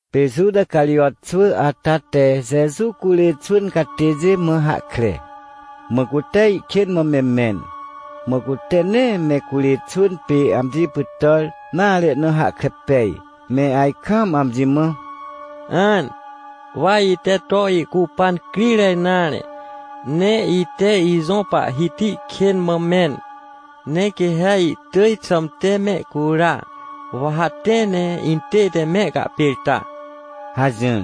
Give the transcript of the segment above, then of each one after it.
Pê Juta Carijot xwỳ ata te Jeju curê xwỳn catêjê mã hahkre. Mã cute ihkên mã me mẽn. Mã cute nee me curê xwỳn pê amji pytàr nare na hahkre pej, me ajkaam amji mã: — An! Wa ite to ihcupan crire nare! Ne ite ijõ Pahhiti kên mã mẽn. Ne quê ha ihtỳj xãmte mehcura! Wa ha tẽ ne intête mehcahpêrta — hajỹr.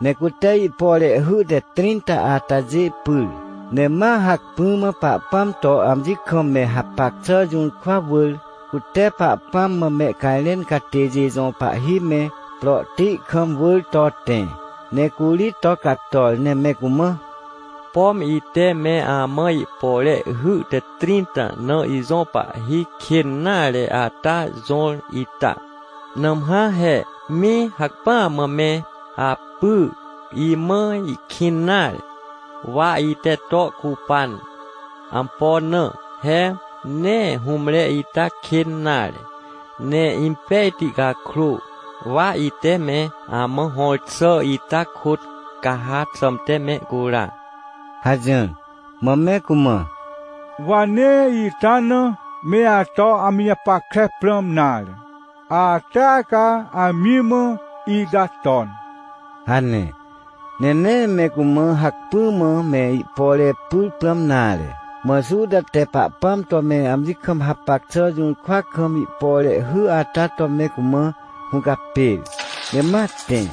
Ne cute ihpore hy te trĩnta atajê pyr, ne ma hacpỹ mã Pahpãm to amji kam me hapac xà jũrkwa wỳr, cute Pahpãm mã mehcajrẽn catêjê jõ pahhi me, prohti kam wỳr to tẽ. Ne curi to cator ne me cumã: — Pom ite me amã ihpore hy te trĩnta na ijõ Pahhi kên nare ata jõr ita. Nãmhã he, mĩ! Hacpỹa mã me apy! Imã ihkĩn nare. Wa ite to ihcupan. Ampo na? He nee hũmre ita kên nare, ne impejti cakrô, wa ite me amã hõr xà ita kôt ca ha xãmte mehcura — hajỹr. Mã me cumã: — Wa nee ita na me ato amji japackre prãm nare, atea ca amji mã ita ton — hane. Ne nee me cumã hacpỹ mã me ihpore pyr prãm nare. Mã Juta te Pahpãm to me amji kam hapac xà jũrkwa kam ihpore hy ata to me cumã hũcapêr, ne ma tẽ.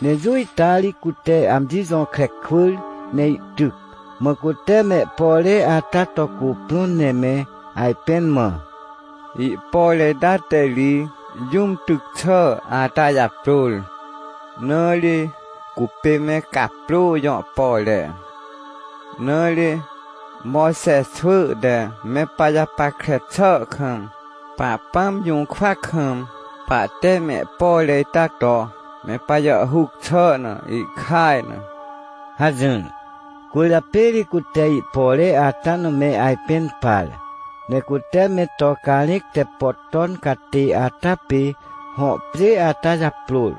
Ne jũ ita ri cute amji jõkre kwỳr ne ihtyc. Mã cute mehpore ata to cuprõn ne me ajpẽn mã: — Ihpore ita te ri jũm tyc xà ata japrôr, na ri cupê me caprô jõ pore. Na ri Mojxe xwỳ te me pajapackre xà kam, Pahpãm jũrkwa kam pahte me ihpore ita to me pajàhhuc xà na ihkaj na — hajỹr. Cwỳrjapê ri cute ihpore ata na me ajpẽn par, ne cute me to carẽc te pot ton catê ata pê, hõ pjê ata japrôr,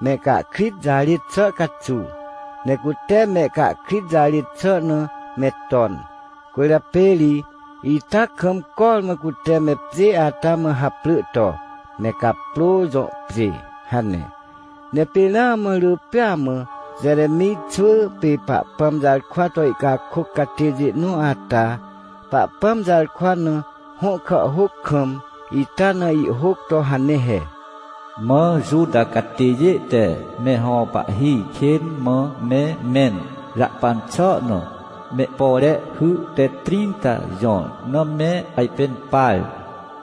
mehcahkrit jarêt xà caxuw. Ne cute mehcahkrit jarêt xà na me ton. Cwỳrjapê ri ita kam cormã cute me pjê ata mã haprỳ to: “Me caprô jõ pjê” hane. Ne pê ramã rỳ pêa mã Jeremij xwỳ pê Pahpãm jarkwa to ihcakôc catêjê nõ ata Pahpãm jarkwa na hõ kàhhôc kam, ita na ihhôc to hane he: “Mã Juta catêjê te me hõ pahhi kên mã me mẽn jahpan xà na, mehpore hy te trĩnta jõr na me ajpẽn par,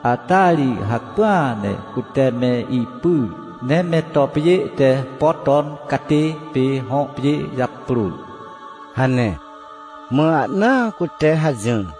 ata ri hacpỹa ne cute me ipyr, ne me to pjê te pot ton catê pê hõ pjê japrôr” hane. Mã ahnaa cute hajỹr.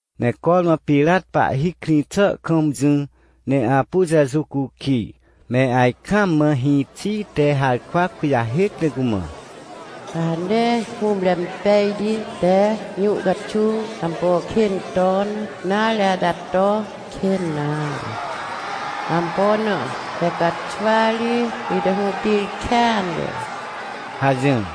Ne cormã Pirat pahhi krĩ xà kam jỹ ne apu Jeju cukij, me ajkaam mã hĩxi te harkwa kujahêc ne cumã: — Ca ha nee hũmre pejti te jũ caxuw ampo kên ton nare ata to kên nare. Ampo na? He caxwa ri ite hũtir kêanre — hajỹr.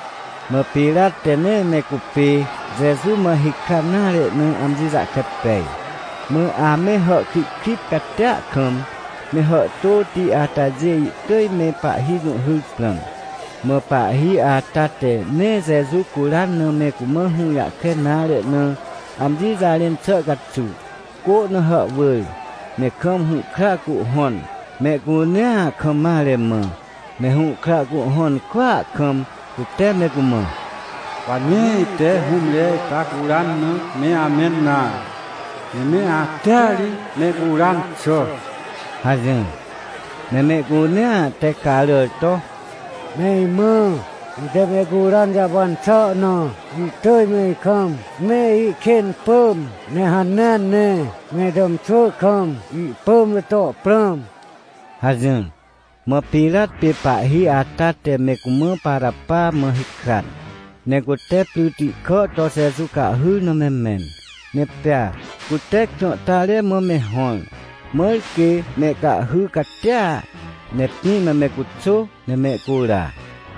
Mã Pirat te nee me cupê Jeju mã hikran nare na amji jahkre pej. Mã ame hàhkrihkrit catia kam, me hàhtôti atajê ihtỳj me pahhi jũhhyr prãm. Mã pahhi ata te nee Jeju curan na me cumã hũjahkre nare na amji jarẽn xà caxuw, cô na hàhwỳr, ne kam hũhkra cuhhõn, mehcunea kam mare mã. Ne hũhkra cuhhõn kwỳa kam cute me cumã: — Wa nee ite hũmre ita curan na me amẽn nare, ne me atea ri mehcuran xà — hajỹr. Ne mehcunea te caràr to: — Me imã, ite mehcuran jahpan xà na, ihtỳj me ikam me ikên pỳm, ne hanea ne me itàmxwỳ kam ihpỳm na to prãm — hajỹr. Mã Pirat pê pahhi ata te me cumã Parapa mã hikran. Ne cute pryti kà to Jeju cahhyr na me mẽn, ne pea cute krãhtare mã me hõr, mãr quê mehcahhy catia, ne pĩ na me cuxô ne mehcura.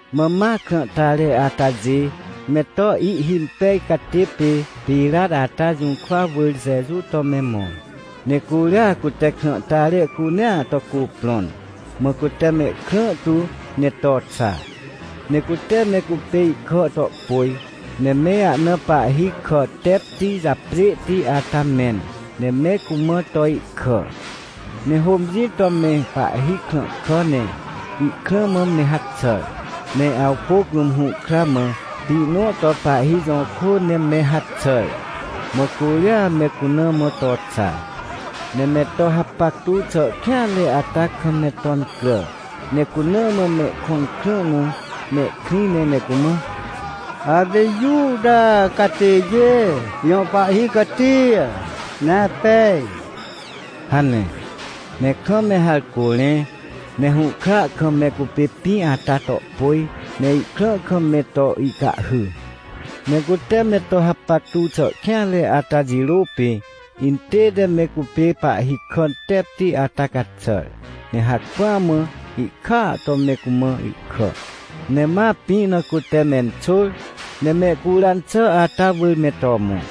Mã ma krãhtare atajê me to ihhimpej catê pê Pirat ata jũrkwa wỳr Jeju to me mõ, ne curia cute krãhtare cunea to cuprõn, mã cute mehkrã tu ne to xa. Ne cute me cupê ihkà to pôj, ne me ahna pahhi kà tepti japjêhti ata mẽn, ne me cumã to ihkà. Ne hômjĩ to me pahhi krãhkà ne ihkrã mã me haxàr. Ne awpôc rũm hũhkra mã pĩ nõ to pahhi jõ kô ne me haxàr. Mã curia me cuna mã to xa. Ne me to hapactu xà kêanre ata kam me to incrà, ne cuna mã mehkõn krã na mehkrĩ ne me cumã: — Apê Juta catêjê jõ pahhi catia ne apej! — hane. Ne kam me harcô rẽ, ne hũhkra kam me cupê pĩ ata to pôj, ne ihkrã kam me to ihcahhy. Ne cute me to hapactu xà kêanre ata jirô pê intête me cupê pahhi kà tepti ata caxàr, ne hacpỹa mã ihkàa to me cumã ihkà. Ne ma pĩ na cute menxôr ne mehcuran xà ata wỳr me to mõ.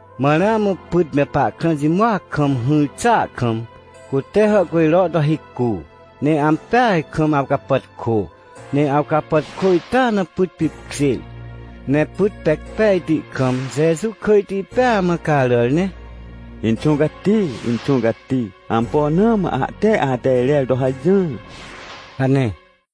Mã ramã pyt me pahkrã jimoac kam hỹr xàa kam, cute hàhcujro to hicu, ne ampeaj kam awcapàtkô, ne awcapàtkô ita na pyt pipkjêr. Ne pyt pec pejti kam Jeju kỳjti pêa mã caràr ne: — Inxũ Cati, Inxũ Cati! Ampo na mã ahte ate irer to hajỹr? — hane.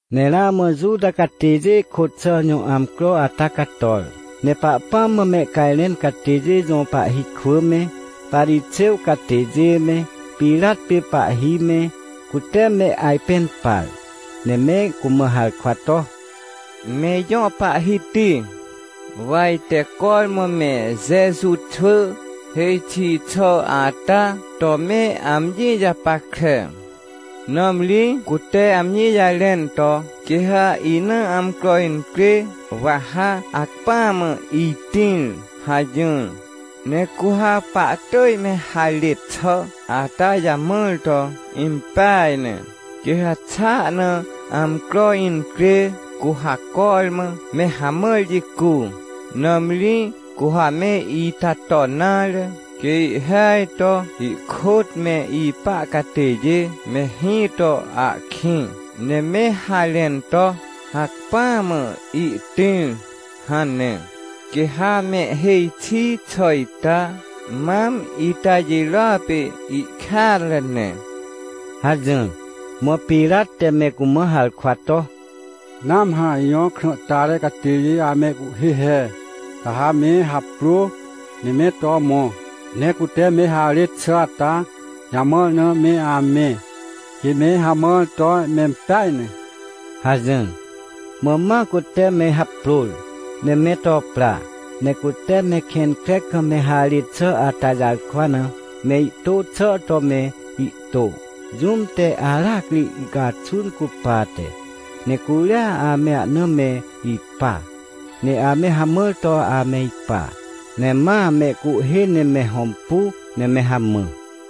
Ne ramã Juta catêjê kôt xà jõ amcro ata cator. Ne Pahpãm mã mehcajrẽn catêjê jõ pahhi kwỳ me, Parixêw catêjê me, Pirat pê pahhi me, cute me ajpẽn par. Ne me cumã harkwa to: — Me ijõ pahhiti, wa ite cormã me Jeju xwỳ hêj xi xà ata to me amji japackre, nãmri cute amji jarẽn to: “Quê ha ina amcro incrê, wa ha hacpỹa mã itĩr” hajỹr. Ne cu ha pahtỳj me harêt xà ata jamãr to impeaj ne, quê ha xa ahna amcro incrê, cu ha cormã me hamãr jicu. Nãmri cu ha me ita ton nare, quê ihhêaj to ihkôt me ipa catêjê me hĩ to ahkĩ, ne me harẽn to: “Hacpỹa mã ihtĩr!” hane. Quê ha mehhêj xi xà ita, mam ita jirôa pê ihkêanre ne — hajỹr. Mã Pirat te me cumã harkwa to: — Nãmhã ijõ krãhtare catêjê amehcuhhê he. Ca ha me haprô, ne me to mõ, ne cute me harêt xà ata jamãr na me amẽ, quê me hamãr to mempeaj ne — hajỹr. Mã ma cute me haprôr, ne me to pra. Ne cute me kẽn kre kam me harêt xà ata jarkwa na, me ihtô xà to me ihtô, jũm te aracri ihcaxun cupate. Ne curia ame ahna me ipa, ne ame hamãr to ame ipa, ne ma mehcuhhê ne me hõmpu, ne me hamã.